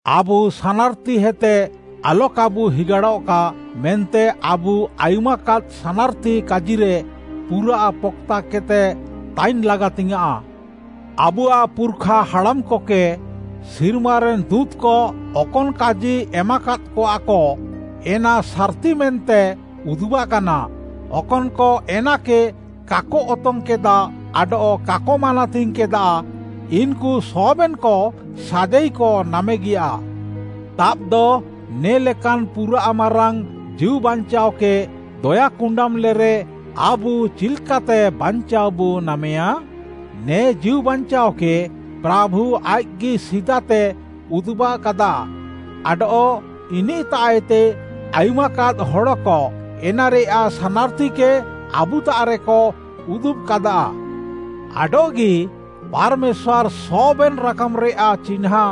ଆବୁ ସାନାର୍‌ତିହେତେ ଆଲକାବୁ ହିଗାଡ଼ଃକା ମେନ୍ତେ ଆବୁ ଆୟୁମାକାଦ୍‌ ସାନାର୍‌ତି କାଜିରେ ପୁରାଃ ପକ୍‌ତାକେଦ୍‌ତେ ତାଇନ୍‌ ଲାଗାତିଙ୍ଗ୍‌ୟାଁଃ। ଆବୁଆଃ ପୁର୍‌ଖା ହାଡ଼ାମ୍‌କକେ ସିର୍ମାରେନ୍‌ ଦୁଁତ୍‌କ ଅକନ୍‌ କାଜି ଏମାକାଦ୍‌କଆକ, ଏନା ସାର୍‌ତି ମେନ୍ତେ ଉଦୁବାକାନା, ଅକନ୍‌କ ଏନାକେ କାକ ଅତଙ୍ଗ୍‌କେଦା ଆଡଃ କାକ ମାନାତିଙ୍ଗ୍‌କେଦା ଇନ୍‌କୁ ସବେନ୍‌କ ସାଜାଇକ ନାମେଗିୟା। ତାବ୍‌ଦ, ନେ'ଲେକାନ୍‌ ପୁରାଃ ମାରାଙ୍ଗ୍‌ ଜୀଉବାଞ୍ଚାଅକେ ଦୟାକୁଣ୍ଡାମ୍‌ଲେରେ ଆବୁ ଚିଲ୍‌କାତେ ବାଞ୍ଚାଅବୁ ନାମେୟାଁ? ନେ ଜୀଉବାଞ୍ଚାଅକେ ପ୍ରାଭୁ ଆଇଃକ୍‌ଗି ସିଦାତେ ଉଦୁବ୍‌କାଦା, ଆଡଃ ଇନିଃତାଃଏତେ ଆୟୁମ୍‌କାଦ୍‌ ହଡ଼କ ଏନାରେୟାଃ ସାନାର୍‌ତିକେ ଆବୁତାଃରେକ ଉଦୁବ୍‌କାଦା। ଆଡଃଗି, ପାର୍‌ମେଶ୍ୱାର୍‌ ସବେନ୍‌ ରାକାମ୍‌ରେୟାଃ ଚିହ୍ନାଁ,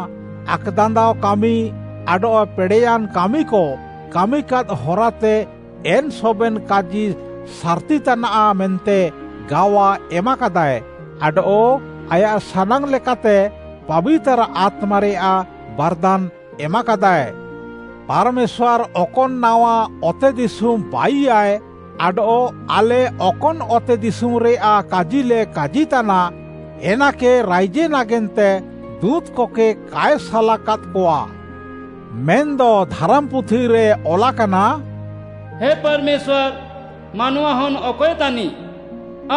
ଆକ୍‌ଦାନ୍ଦାଅ କାମି ଆଡଃ ପେଡ଼େୟାନ୍‌ କାମିକ କାମିକାଦ୍‌ ହରାତେ ଏନ୍‌ ସବେନ୍‌ କାଜି ସାର୍‌ତି ତାନାଃ ମେନ୍ତେ ଗାୱା ଏମାକାଦାଏ ଆଡଃ ଆୟାଃ ସାନାଙ୍ଗ୍‌ଲେକାତେ ପାବିତାର୍‌ ଆତ୍ମାରେୟାଃ ବାର୍‌ଦାନ୍‌ ଏମାକାଦାଏ। ପାର୍‌ମେଶ୍ୱାର୍‌ ଅକନ୍‌ ନାୱା ଅତେଦିଶୁମ୍‌ ବାଇୟାଏ ଆଡଃ ଆଲେ ଅକନ୍‌ ଅତେଦିଶୁମ୍‌ରେୟାଃ କାଜିଲେ କାଜିତାନା, ଏନାକେ ରାଇଜେ ନାଗେନ୍ତେ ଦୁଁତ୍‌କକେ କାଏ ସାଲାକାଦ୍‌କଆ। ମେନ୍‌ଦ ଧାରାମ୍‌ପୁଥିରେ ଅଲାକାନା, “ହେ ପାର୍‌ମେଶ୍ୱାର୍‌, ମାନୱାହନ୍‌ ଅକଏ ତାନିଃ,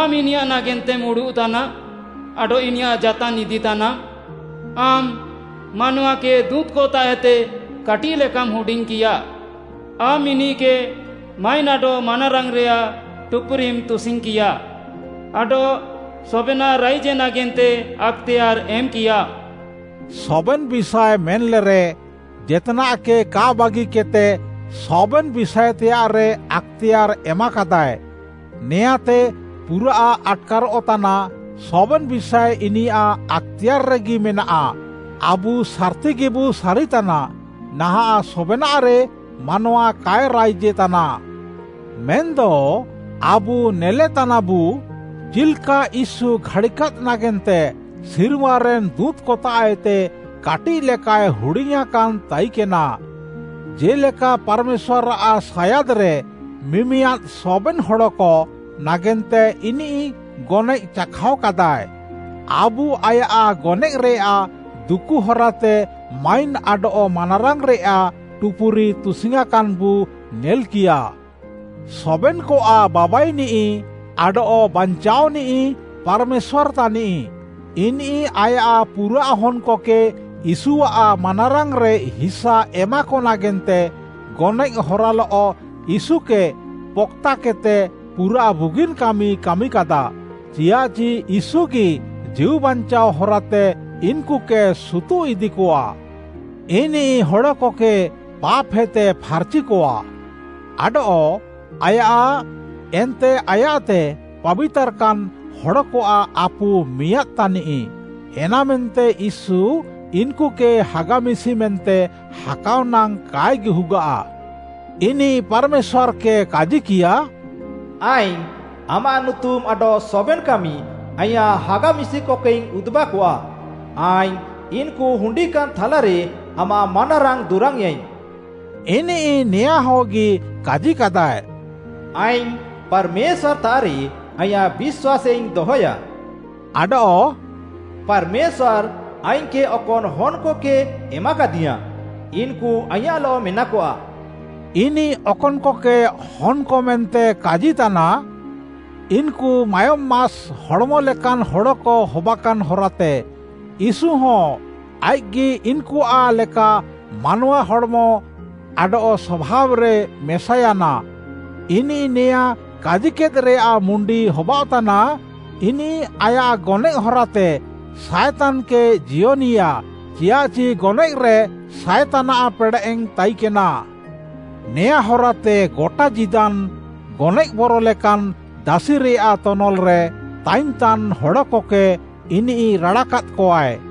ଆମ୍‌ ଇନିୟାଃ ନାଗେନ୍ତେମ୍‌ ଉଡ଼ୁଃତାନା ଆଡଃ ଇନିୟାଃ ଜାତାନ୍‌ ଇଦିତାନାମ୍‌? ଆମ୍‌ ମାନୱାକେ ଦୁଁତ୍‌କତାଃଏତେ କାଟିଃଲେକାମ୍‌ ହୁଡିଙ୍ଗ୍‌କିୟା। ଆମ୍‌ ଇନିଃକେ ମାଇନ୍‌ ଆଡଃ ମାନାରାଙ୍ଗ୍‌ରେୟାଃ ଟୁପୁରିମ୍‌ ତୁସିଙ୍ଗ୍‌କିୟା। ଆଡଃ ସବେନାଃ ରାଇଜେ ନାଗେନ୍ତେ ଆକ୍‌ତେୟାର୍‌ ଏମ୍‌କିୟାମ୍‌।” “ସବେନ୍‌ ବିଷାଏ” ମେନ୍‌ଲେରେ, ଜେତ୍‌ନାଃକେ କା ବାଗିକେଦ୍‌ତେ ସବେନ୍‌ ବିଷାଏତେୟାଃରେ ଆକ୍‌ତେୟାର୍‌ ଏମାକାଦାଏ। ନେଆଁଁତେ ପୁରା ଆଟ୍‌କାରଃ ତାନା, ସବେନ୍‌ ବିଷାଏ ଇନିୟାଃ ଆକ୍‌ତେୟାର୍‌ରେଗି ମେନାଃ। ଆବୁ ସାର୍‌ତିଗିବୁ ସାରିତାନା, ନାହାଁଃ ସବେନାଃରେ ମାନୱା କାଏ ରାଇଜେ ତାନା। ମେନ୍‌ଦ ଆବୁ ନେଲେତାନାବୁ, ଚିଲ୍‌କା ୟୀଶୁ ଘାଡ଼ିକାଦ୍‌ ନାଗେନ୍ତେ ସିର୍ମାରେନ୍‌ ଦୁଁତ୍‌କତାଃଏତେ କାଟିଃଲେକାଏ ହୁଡିଙ୍ଗ୍‌ୟାଁକାନ୍‌ ତାଇକେନା, ଜେ'ଲେକା ପାର୍‌ମେଶ୍ୱାର୍‌ଆଃ ସାୟାଦ୍‌ରେ ମିମିୟାଦ୍‌ ସବେନ୍‌ ହଡ଼କ ନାଗେନ୍ତେ ଇନିଃ ଗନଏଃ ଚାଖାଅକାଦାଏ। ଆବୁ ଆୟାଃ ଗନଏଃରେୟାଃ ଦୁକୁ ହରାତେ ମାଇନ୍‌ ଆଡଃ ମାନାରାଙ୍ଗ୍‌ରେୟାଃ ଟୁପୁରି ତୁସିଙ୍ଗ୍‌କାନ୍‌ବୁ ନେଲ୍‌କିୟା। ସବେନ୍‌କଆଃ ବାବାଇନିଃ ଆଡଃ ବାଞ୍ଚାଅନିଃ, ପାର୍‌ମେଶ୍ୱାର୍‌ ତାନିଃ। ଇନିଃ ଆୟାଃ ପୁରାଃ ହନ୍‌କକେ ୟୀଶୁଆଃ ମାନାରାଙ୍ଗ୍‌ରେ ହିସା ଏମାକ ନାଗେନ୍ତେ, ଗନଏଃ ହରାଲଃ ୟୀଶୁକେ ପକ୍‌ତାକେଦ୍‌ତେ ପୁରାଃ ବୁଗିନ୍‌ କାମି କାମିକାଦା। ଚିୟାଃଚି ୟୀଶୁଗି ଜୀଉବାଞ୍ଚାଅ ହରାତେ ଇନ୍‌କୁକେ ସୁତୁଃଇଦିକଆ। ଇନିଃ ହଡ଼କକେ ପାପ୍‌ହେତେ ଫାର୍‌ଚିକଆ। ଆଡଃ ଆୟାଃ ଏନ୍ତେ ଆୟାଃତେ ପାବିତାର୍‌କାନ୍‌ ହଡ଼କଆଃ ଆପୁ ମିଆଁଦ୍‌ ତାନିଃ। ଏନାମେନ୍ତେ ୟୀଶୁ ଇନ୍‌କୁକେ ହାଗା ମିଶି ମେନ୍ତେ ହାକାଅ ନାଙ୍ଗ୍‌ କାଏ ଗିହୁଗାଃ। ଇନିଃ ପାର୍‌ମେଶ୍ୱାର୍‌କେ କାଜିକିୟା, “ଆଇଙ୍ଗ୍‌ ଆମାଃ ନୁତୁମ୍‌ ଆଡଃ ସବେନ୍‌ କାମି ଆଇଁୟାଃ ହାଗା ମିଶିକକେଇଙ୍ଗ୍‌ ଉଦୁବ୍‌କଆ। ଆଇଙ୍ଗ୍‌ ଇନ୍‌କୁ ହୁଣ୍ଡିକାନ୍‌ ଥାଲାରେ ଆମାଃ ମାନାରାଙ୍ଗ୍‌ ଦୁରାଙ୍ଗ୍‌ୟେଁଇଙ୍ଗ୍‌।” ଇନିଃ ନେୟାଁହଗି କାଜିକାଦାଏ, “ଆଇଙ୍ଗ୍‌ ପାର୍‌ମେଶ୍ୱାର୍‌ତାଃରେ ଆଇଁୟାଃ ବିଶ୍ୱାସାଇଙ୍ଗ୍‌ ଦହେୟା” ଆଡଃ “ପାର୍‌ମେଶ୍ୱାର୍‌ ଆଇଙ୍ଗ୍‌କେ ଅକନ୍‌ ହନ୍‌କକେ ଏମାକାଦିୟାଁ, ଇନ୍‌କୁ ଆଇଁୟାଃଲଃ ମେନାକଆ।” ଇନିଃ ଅକନ୍‌କକେ ହନ୍‌କ ମେନ୍ତେ କାଜିତାନା, ଇନ୍‌କୁ ମାୟୋମ୍‌ ମାସ୍ ହଡ଼୍‌ମ ଲେକାନ୍‌ ହଡ଼କ ହବାକାନ୍‌ ହରାତେ ୟୀଶୁହଁ ଆଇଃକ୍‌ଗି ଇନ୍‌କୁଆଃ ଲେକା ମାନୱା ହଡ଼୍‌ମ ଆଡଃ ସଭାବ୍‌ରେ ମେସାୟାନା। ଇନିଃ ନେୟାଁ କାଜିକେଦ୍‌ରେୟାଃ ମୁଣ୍ଡି ହବାଅଃତାନା, ଇନିଃ ଆୟାଃ ଗନଏଃ ହରାତେ ସାଏତାନ୍‌କେ ଜିୟନିଆ, ଚିୟାଃଚି ଗନଏଃରେ ସାଏତାନ୍‌ଆଃ ପେଡ଼େଃ ତାଇକେନା। ନେଆଁ ହରାତେ ଗଟା ଜୀଦାନ୍‌ ଗନଏଃ ବର ଲେକାନ୍‌ ଦାସିରେୟାଃ ତନଲ୍‌ରେ ତାଇନ୍‌ତାନ୍‌ ହଡ଼କକେ ଇନିଃ ରାଡ଼ାକାଦ୍‌କଆଏ।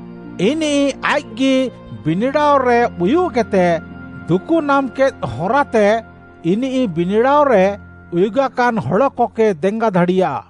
ଇନିଃ ଆଇଃକ୍‌ଗି ବିନିଡ଼ାଅରେ ଉୟୁଃକେଦ୍‌ତେ ଦୁକୁ ନାମ୍‌କେଦ୍‌ ହରାତେ, ଇନିଃ ବିନିଡ଼ାଅରେ ଉୟୁଗାକାନ୍‌ ହଡ଼କକେ ଦେଙ୍ଗା ଦାଡ଼ିୟା।